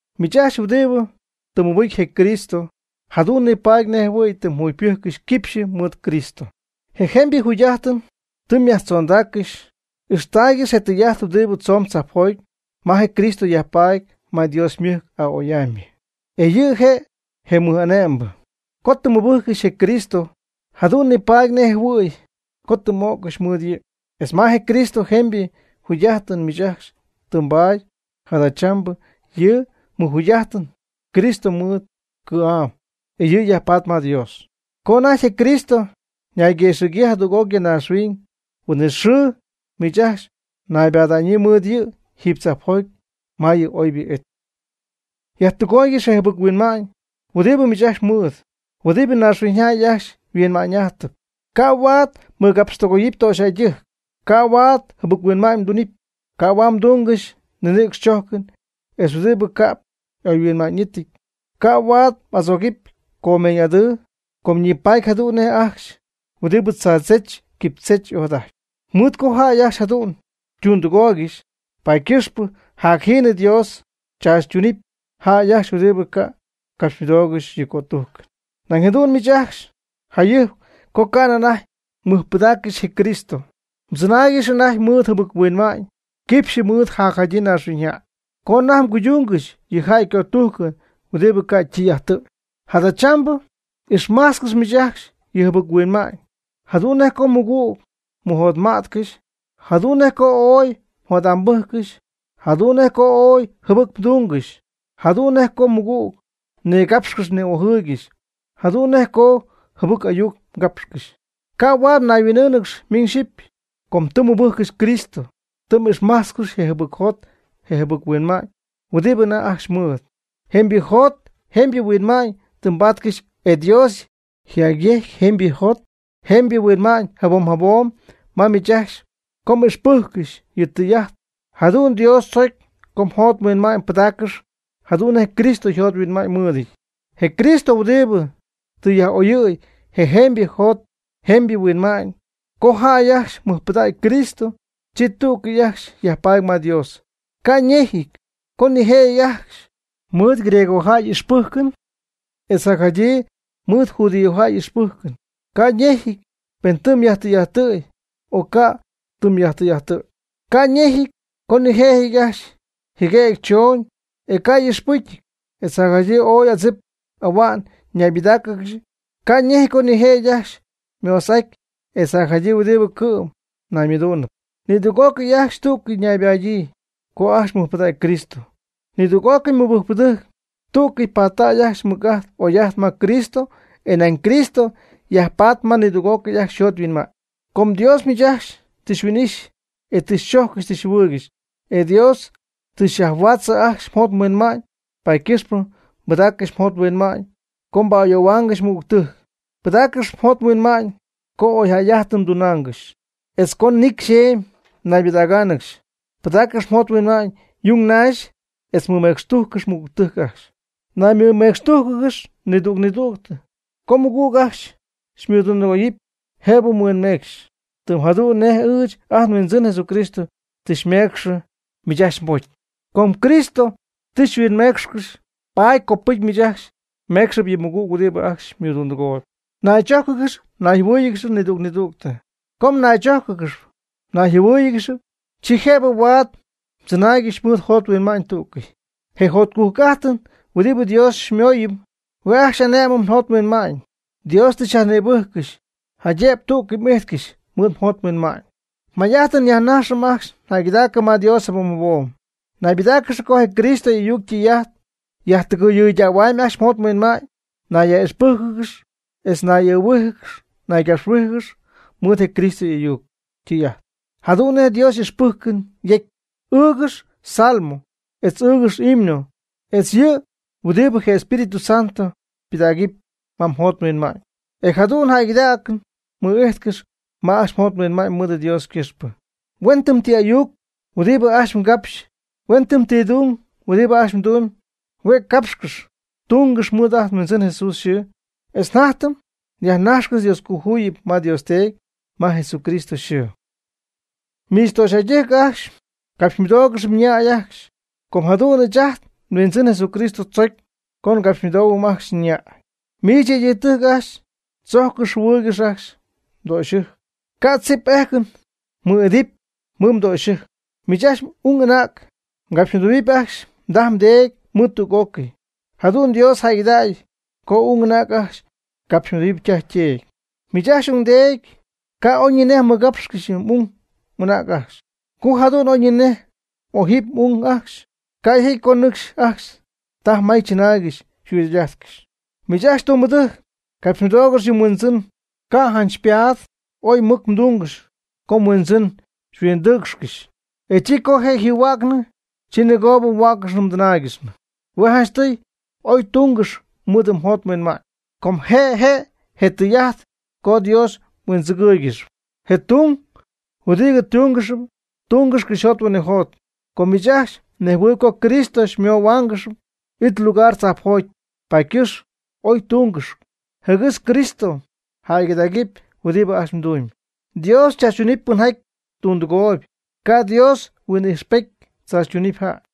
Miich ajcxy huɨdibɨ tɨ mmɨbɨcy je Cristo jadu'n nipaady nejɨhuɨ̈y tɨ mjugypɨjccɨxy quipxyɨ mɨɨd Cristo, e jemybɨ jugy'ajtɨn tɨ myajtzondaaccɨxy. Ixtaaygɨx je tɨy'ajt huɨdibɨ tzomb tzajpjoty ma je Cristo yajpaady ma Dios ymɨjc a'oy'amybɨ, e yɨ' je' je mɨj'ane'mbɨ. Co tɨ mmɨbɨjccɨxy je Cristo jadu'n nipaady nejjɨhuɨ̈y co tɨ m'o'ccɨxy mɨɨd yɨ', etz ma je Cristo jemybɨ jugy'ájtɨn miich ajcxy tɨ mbaady. Jadachambɨ yɨ mjugy'ájtɨn Cristo mɨɨd cɨ̈'am, e yɨ' yajpaatp ma Dios. Co anajty je Cristo ñayguëxɨ̈gyii jadüg'oc ya naaxhuiñ, huin'it xɨɨ miich ajcxy mnaybada'ñyii mɨɨd yɨ' jiiby tzajpjoty ma yɨ oybɨ it. Yajtɨgooygɨx je jɨbɨc-huinma'ñ huɨdibɨ miich ajcxy mɨɨd, huɨdibɨ naaxhuiñyjäy ajcxy yhuinma'ñ'ajtɨp. Ca' huaad mɨɨdcapxtɨgoyɨpy töxyjäydɨjc. Ca' huaad jɨbɨc-huinma'ñ mdunɨpy. Ca' huaad mdungɨxy ninïcx chojcɨn, etz huɨdibɨ ca'p y'oyhuinma'ñɨty. Ca' huaad m'adzogɨpy comeeñ'adɨɨ, com ñipaatpy jadu'n nej ajcxy huɨdibɨ tzaadzech quipychech ojadajtp. Mɨɨd co jäy ajcxy jadu'n ytundɨgooygɨxy, paady ycɨxpɨ jacjiinɨ Dios tzaachytunɨp jäy ajcxy huɨdibɨ ca' ycapxymɨdoogɨxy yɨ' ycötujcɨn. Nañ jadu'n miich ajcxy jayɨjp co ca'nɨ anajty mmɨjpɨdaaccɨxy je Cristo, mdzɨnaaygɨxy anajty mɨɨd jɨbɨc-huinma'ñ quipxy mɨɨd je jacjadyii naaxhuiñyjäy co anajty mguydungɨxy yɨ jäy ycötujcɨn huɨdibɨ ca' ytɨy'ajtɨty. Jadachambɨ ixmajtzcɨx miich ajcxy yɨ jɨbɨc-huinma'ñ jadu'n nej co mɨgüg mmɨjotma'tcɨxy, jadu'n nej co ooy mjot'ambɨjccɨxy, jadu'n nej co jɨbɨc mdungɨxy, jadu'n nej co mɨgüg mnigapxcɨxy ni'ojɨɨygɨxy, jadu'n nej co jɨbɨc ayuc mgapxcɨxy. Ca' huaad mnayhuin'ɨ́ɨnɨgɨxy miñ xyɨpy. Co tɨ mmɨbɨjccɨxy Cristo tɨ m'ixmajtzcɨxy je jɨbɨcjot je jɨbɨc-huinma'ñ huɨdi anajty ajcxy mɨɨd. Jemybɨ jot jemybɨ huinma'ñ tɨ mbatcɨxy e Dios yjacyejcyp jemybɨ jot jemybɨ huinma'ñ jabom jabom ma miich ajcxy co m'ixpɨjccɨxy yɨ' ytɨy'ajt. Jadu'n Dios tzocy co mjot mhuinma'ñ mbɨdáaccɨxɨpy jadu'n nej Cristo jot huinma'ñ mɨɨdɨty, je Cristo huɨdibɨ tɨ yaj'oyɨ̈y je jemybɨ jot jemybɨ yhuinma'ñ. Co jäy ajcxy mɨjpɨdägy Cristo, chi tú'cɨy ajcxy yajpaady ma Dios, ca' ñejɨty co nijëjɨty ajcxy mɨɨd griegojäy y'ixpɨjcɨn etz jacjadyii mɨɨd judíojäy y'ixpɨjcɨn, ca' ñejɨty pen tɨ myajtɨy'ajttɨ̈y o ca' mdɨy'ajttɨ̈yɨty. Ca ñejɨty co nijëjɨty ajcxy jɨguëgy chooñ, e ca' y'ixpɨcyɨty, etz jacjadyii ooy adzip ahua'n ñaybɨdáacɨgɨxy. Ca' ñejɨty co nijëjɨty ajcxy moso'ajtp etz jacjadyii huɨdibɨ cɨ'm naymɨduunɨp. Nidüg'ócɨy ajcxy tú'cɨy ñaybɨdägyii co ajcxy mɨjpɨdägy Cristo. Nidüg'ócɨy mɨbɨjcpɨdɨjc tú'cɨy pattay ajcxy mɨc'ajt oy'ajt ma Cristo, e nañ Cristo yajpaady ma nidüg'ócɨy ajcxy yjot yhuinma'ñ. Com Dios miich ajcxy tɨ xyhuin'ixy, e tɨ xychojccɨxy tɨ xyjɨhuɨɨygɨxy, e Dios tɨ xyajhuädzɨ ajcxy mjot mhuinma'ñ, paady ycɨxpɨ pɨdaaccɨx mjot mhuinma'ñ co mba'ayoohuaangɨxy mɨgügtɨjc. Pidaaccɨx mjot mhuinma'ñ co oyjäy'ajtɨn mdunaangɨxy etz co nicy xemy mnaybɨdägaangɨxy. Pɨdaaccɨx mjot mhuinma'ñ yung naxy etz mɨmecxtujccɨxy mɨgügtɨjc ajcxy. Naymɨmecxtújcɨgɨx nidüg nidüg. Co mmɨgüg ajcxy xymɨdundɨgooyɨpy jëbɨ mhuinmeecxɨpy tɨm jadu'n nej ɨɨch ajt nHuindzɨn Jesucristo tɨ mecxy miich ajcxy mbocy. Com Cristo tɨ xyhuinmeecxcɨxy, paady copɨcy miich ajcxy meecxɨp yɨ mɨgüg huɨdibɨ ajcxy xymɨdundɨgooyb. Mnaychójcɨgɨx mnayjɨhuɨɨyɨgɨx nidüg nidüg. Co mnaychójcɨgɨxɨpy nayjɨhuɨɨyɨgɨxɨpy, chi jëb huaad mdzɨnaaygɨxy mɨɨd mjot mhuinma'ñ tú'cɨy. Je jotcujc'ájtɨn huɨdibɨ Dios xymooyɨm, huen ajcxy xy'ane'mɨ mjot mhuinma'ñ. Dios tɨ xyajnïbɨjccɨxy, jaydëb tú'cɨy m'ijtcɨxy mɨɨd mjot mhuinma'ñ. Mjatytɨm yajnaxɨpy ajcxy jäygɨdaacɨn ma Dios jabom jabom. Naybɨdáacɨgɨx co je Cristo y'ayuc ytɨy'ajt yajtɨgɨɨydähuamyb ajcxy mjot mhuinma'ñ. Nayyaj'ixpɨ́jcɨgɨx etz nay'ɨɨhuíjɨgɨx naygapxhuíjɨgɨx mɨɨd je Cristo y'ayuc ytɨy'ajt, jadu'n nej Dios ijxpɨjcɨn yecy. Ɨɨgɨx Salmo etz ɨɨgɨx himno etz yɨ ɨy huɨdibɨ je Espíritu Santo ypɨdägɨp ma mjot mhuinma'ñ, e jadu'n jäygɨdaacɨn mɨ'ijtcɨxy ma ajcxy mjot mhuinma'ñ mɨɨd Dios ycɨxpɨ. Huen ti ayuc huɨdibɨ ajcxy mgapxyp, huen ti tung huɨdibɨ ajcxy mdumby, hue' capxcɨx tungɨx mɨɨd ajt nHuindzɨn Jesús yxɨɨ. Etz jatytɨm yajnajxcɨxy Dioscojuyip ma Dios Teedy ma Jesucristo yxɨɨ. Miich töxyjäydɨjc ajcxy, capxymɨdoogɨx mñäy ajcxy com jadu'n ɨɨch ajt nHuindzɨn Jesucristo tzocy co mgapxymɨdohuɨpy ajcxy mñäy. Miich yëydɨjctɨjc ajcxy, tzojccɨx jɨhuɨɨygɨx ajcxy mdöxyɨjc, ca' ejcɨn mmɨɨ'idɨpy mɨɨd mdöxyɨjc. Miich ajcxy ung anäg, mgapxymɨdohuɨpy ajcxy mdaj mdeedy mɨɨd tüg'ócɨy. Jadu'n Dios jäygɨdägy co ung anäg ajcxy capxymɨdoy ytaj yteedy. Miich ajcxy ungdeedy ca' oyñinej mmɨgapxcɨxy m'ung m'anäg ajcxy. Co jadu'n oyñinej m'ojɨpy m'ung ajcxy, ca' yjecyɨty co nɨcxy ajcxy taj may chɨnaaygɨxy yjugy'ajtcɨxy. Miich ajcxy tumbɨdɨjc, capxymɨdoogɨx yɨ mHuindzɨn, ca' janch xypaat oy mɨc mdungɨxy co mhuindzɨn jɨm xyhuindɨɨcxcɨxy, e chi co je' yjɨhuäcnɨ, chi nɨgoo mhuäccɨxnɨ mdɨnaaygɨxnɨ. Hue' janchtɨy oy tungɨxy mɨɨd oyjot oyhuinma'ñ, com je' je' je tɨy'ajt co Dios mhuindzɨgɨɨygɨxy. Je tung huɨdibɨ mdungɨxyp, tungɨx cɨxyjot huinɨjot. Com miich ajcxy mnejhuɨɨyb co Cristo xymöhuaangɨxy it lugar tzajpjoty, paady ycɨxpɨ oy tunggɨx jɨgɨx Cristo jäygɨdägɨpy huɨdibɨ ajcxy mdumyb. Dios chaachytunɨpy pɨnjaty tundɨgooyb. Ca' Dios huin'ijxpety tzaachytunɨpy jäy.